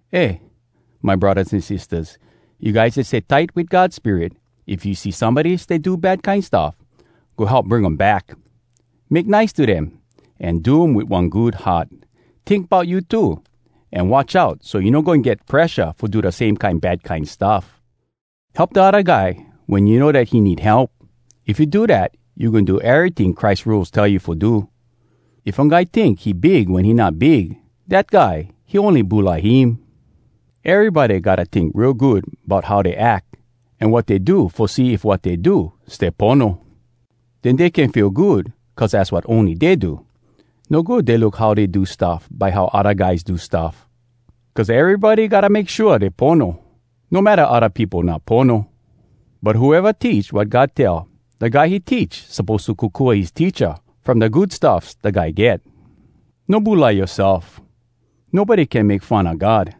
Eh, my braddahs an sistahs, you guys dat stay tight wit God Spirit, if you see somebody stay do bad kine stuff, go help bring um back! Make nice to dem, an do um wit one good heart. Tink bout you too, an watch out, so you no goin get presha fo do da same kine bad kine stuff. Help da odda guy wen you know dat he need help. If you do dat, you goin do eryting Christ rules tell you fo do. If one guy tink he big wen he not big, dat guy, he ony bulai him. Erybody gotta tink real good bout how dey ack an wat dey do fo see if wat dey do stay pono. Den dey can feel good cuz az wat ony dey do. No good dey look how dey do stuff by how odda guys do stuff. Cuz erybody gotta make shua dey pono, no matta odda peopo not pono. But whoeva teach wat God tell, da guy he teach suppose to kokua his teacha from da good stuffs da guy get. No bulai yoaself. Nobody no can make fun a God.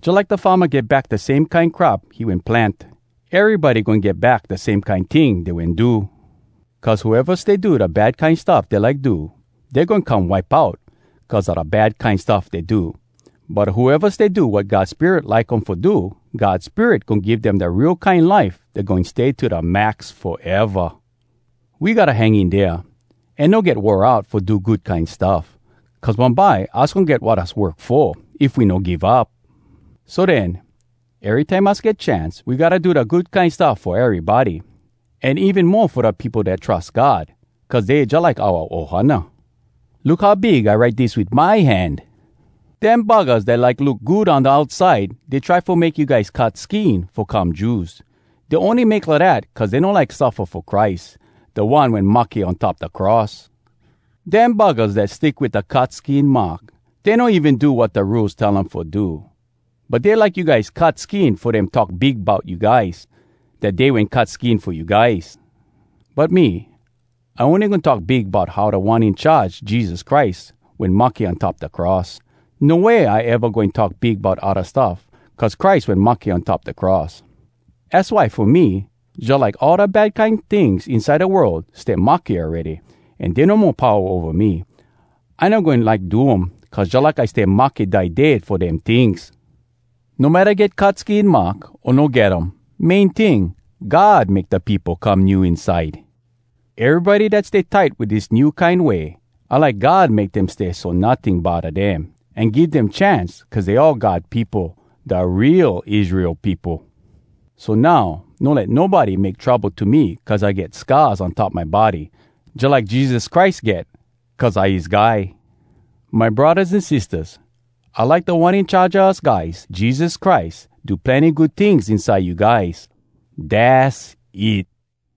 Jalike da farma get back da same kine crop he wen plant, erybody goin get back da same kine ting dey wen do. Cuz whoeva stay do da bad kine stuff dey like do, dey goin come wipe out cuz a da bad kine stuff dey do. But whoeva stay do wat God Spirit like um fo do, God Spirit goin give dem da real kine life dat goin stay to da max foeva! We gotta hang in dea, an no get wore out fo do good kine stuff. Cuz bumbye us goin get wat us work fo, if we no give up. So den, erytime us get chance, we gotta do da good kine stuff fo erybody, an even mo fo da peopo dat trus God cuz dey jalike oua ohana. Look how big I write dis wit my hand! Dem buggahs dat like look good on da outside, dey try fo make you guys cut skin fo come Jews. Dey ony make lidat cuz dey no like suffa fo Christ, da One wen mahke on top da cross. Dem buggahs dat stick wit da cut skin mark, dey no even do wat da Rules tell um fo do. But dey like you guys cut skin fo dem talk big bout you guys, dat dey wen cut skin fo you guys. But me, I ony goin talk big bout how Da One In Charge, Jesus Christ, wen mahke on top da cross. No way I eva goin talk big bout odda stuff cuz Christ wen mahke on top da cross. Az why fo me, jalike all da bad kine tings inside da world stay mahke awready, an dey no mo powa ova me. I no goin like do um, cuz jalike I stay mahke die dead fo dem tings. No matta get cut skin mark, o no get um, main ting, God make da peopo come new inside. Erybody dat stay tight wit dis new kine way, I like God make dem stay so notting bodda dem, an give dem chance cuz dey all God peopo, da real Israel peopo. So now, no let nobody make trouble to me cuz I get scars on top my body jalike Jesus Christ get cuz I his guy. My braddahs an sistahs, I like Da One In Charge a us guys, Jesus Christ, do plenny good tings inside you guys. Dass it!